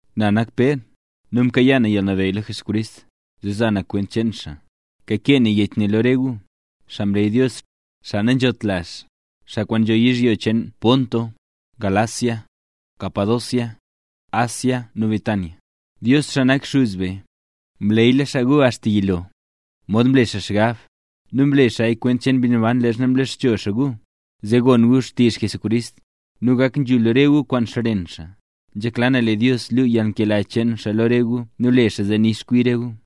Na nak Pér, nu mkayaa na yalnabeyy lo Jesucrist, zee za na kwent cheen xaa; kakee na yech ne lo re gu, xaa mleey Dios, xaa nanzhot lazh, xaa kwaan nzho yizhyo cheen Ponto, Galacia, Capadocia, Asia nu Bitinia. Dios, xaa nak Xuz be, mleeyla xaa gu axta yilo, mod mlela xaa xgab, nu mle xaaya kwent cheen Mbi Naban leezha mlexcho xaa gu, zee gon gu xtizh Jesucrist, nu gak nzhul re gu kwaan xren xaa. Nzhekla na lee Dios luu yalnkela cheen xaa lo re gu nu le xaa zee nix kwi re gu.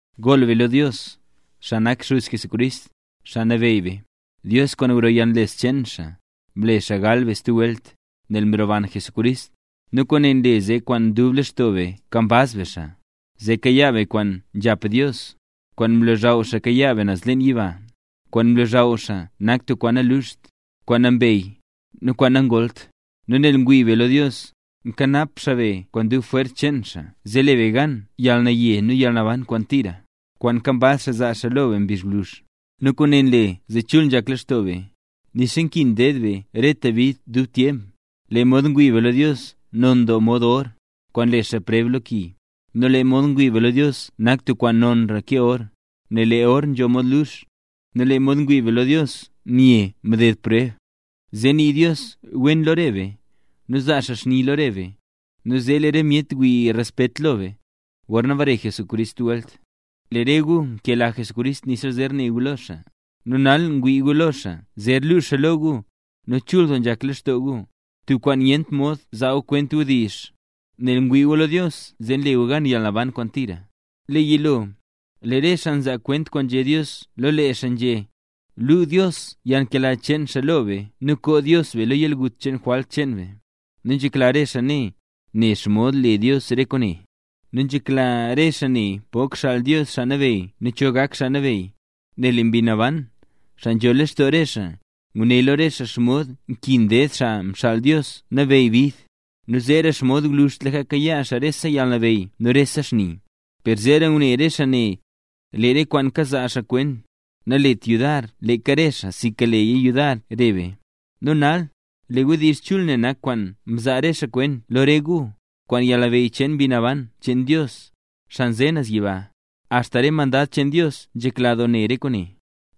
Gool be lo Dios, xaa nak Xuz Jesucrist, Xaa Nabeyy be. Dios kwaan gro yalnles cheen xaa, mle gal be stub welt, nel mroban Jesucrist; nu kwaane nle zee kwaan dub lextoo be nkambaz be xaa, zee kayaa be kwaan nzhap Dios, kwaan mlozhaw xaa kayaa be naz leen yiba. Kwaan mlozhaw xaa nak tub kwaan nanluxt, kwaan nambey, nu kwaan nangoolt. Nu nel ngwii be lo Dios, nkanap xaa be kwaan dub jwers cheen xaa zee le be gan yalnaye nu yalnaban kwaan tira, kwaan nkambaz xaa zaa xaa lo be mbizh gwluzh. Nu kwaane nle zee chul nzhak lextoo be, nixa nkin ded be rete bid tub tyemp. Lee mod ngwii be lo Dios non doo mod or, kwaan nle xaa preb lo ki; nu lee mod ngwii be lo Dios nak tub kwaan nonra ke or, nel lee or nzho mod lux. Nu lee mod ngwii be lo Dios mye mded preb, zee nii Dios wen lo re be, nu zaa xaa xni lo re be, nu zee lee re myet wii respet lo re be, gorna bare Jesucrist stub welt. Lee re gu nkela Jesucrist nixa zer ne gu lo xaa, nu nal ngwii gu lo xaa nixa zer lu xaa lo gu, nu chul doo nzhak lextoo gu, tub kwaan nyent mod zaa gu kwent kwaan wdizh, nel ngwii gu lo Dios zee nle gu gan yalnaban kwaan tira. Lee yilo, lee re xaa mzaa kwent kwaan nzhé Dios lo lee xaa nzhé, luu Dios yalnkela cheen xaa lo be nu koo Dios be lo yalgut cheen jwalt cheen be. Nu nzhekla re xaa ne, ne xomod le Dios re kwaane. Nu nzhekla re xaa ne pok xaal Dios Xaa Nabeyy nu cho gak Xaa Nabeyy, nel lee Mbi Naban, xaa nzho lextoo re xaa, nguné lo re xaa xomod nkin ded Xaa Mxaal Dios Nabeyy bid, nu zeera xomod gwluzhtlaka kayaa xaa rese yalnabeyy nu rese xni. Per zeera ngune re xaa ne, lee re kwaan kazaa xaa kwent, nalet yudar leeka re xaa, sinka leeya le yudar re be. Nu nal, lee wdizh chul ne nak kwaan mzaa re xaa kwent lo re gu, kwaan yalnabeyy cheen Mbi Naban cheen Dios, xaa nze naz yiba. ¡Axta re mandad cheen Dios nzhekla doo ne re kwaane!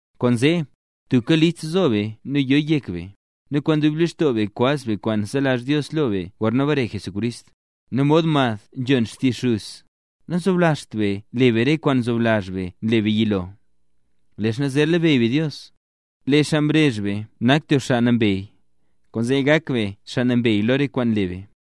Kwaanzee, tubka list zo be nu yo yek be, nu kwaan dub lextoo be kwaz be kwaan zelazh Dios lo be gorna bare Jesucrist. Nu mod mad nzhon xtizh xuz, nazoblazhtra be le be re kwaan mzoblazh be nle be yilo, leezha zer labeyy be Dios. Lee xaa mrezh be nak tub xaa nambey, kwaanzee gak be xaa nambey lo rese kwaan nle be.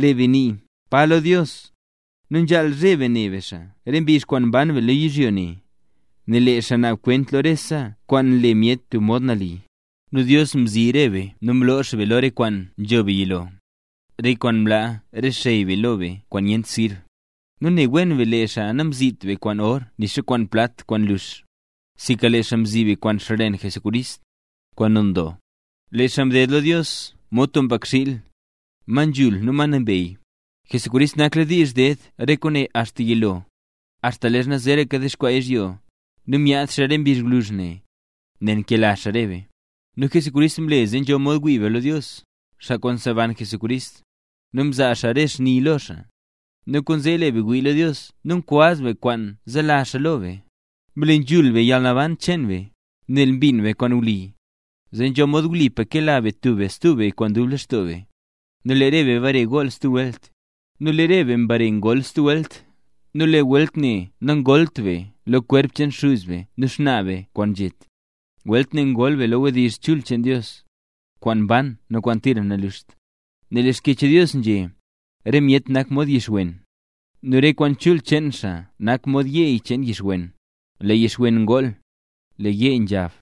Lee be nii “Pa” lo Dios, nu nzhaal zheb be ne be xaa re mbizh kwaan mban be lo yizhyo ne, nel lee xaa naab kwent lo rese kwaan nle myet tub mod nali. Nu Dios mzi re be nu mloo xaa be lo re kwaan nzho be yilo, re kwaan mlaa re xey be lo be kwaan nyent sirb; nu ne wen be lee xaa namzit be kwaan or nixa kwaan plat kwaan nlux, sinka lee xaa mzi be kwaan xren Jesucrist, kwaan non doo. Lee xaa mded lo Dios mod tub mbakxiil, ma nzhul nu ma nambey. Jesucrist nakladiizh ded re kwaane axta yilo, axta leezha zeeraka dexkwaa yizhyo; nu myaad xaa re mbizh gwluzh ne, nel nkela xaa re be. Nu Jesucrist mle zee nzho mod wii be lo Dios, xaa kwaan mseban Jesucrist, nu mzaa xaa re xni lo xaa; nu kwaanzee lee be ngwii lo Dios nu nkambaz be kwaan zelazh xaa lo be. Mle nzhul be yalnaban cheen be, nel mbin be kwaan wli, zee nzho mod wlipa kela be tub be stub be kwaan dub lextoo be. Nu lee re be mbare ngol stub welt, nu lee welt ne nangolt be lo kwerp cheen xuz be nu xnaa be kwaan nzhet, welt ne ngol be lo wdizh chul cheen Dios, kwaan mban nu kwaan tira naluxt. Nel lee Xkyech Dios nzhé: Re myet nak mod yixwen, nu rese kwaan chul cheen xaa nak mod yeey cheen yixwen. Lee yixwen ngool, lee yeey nzhab,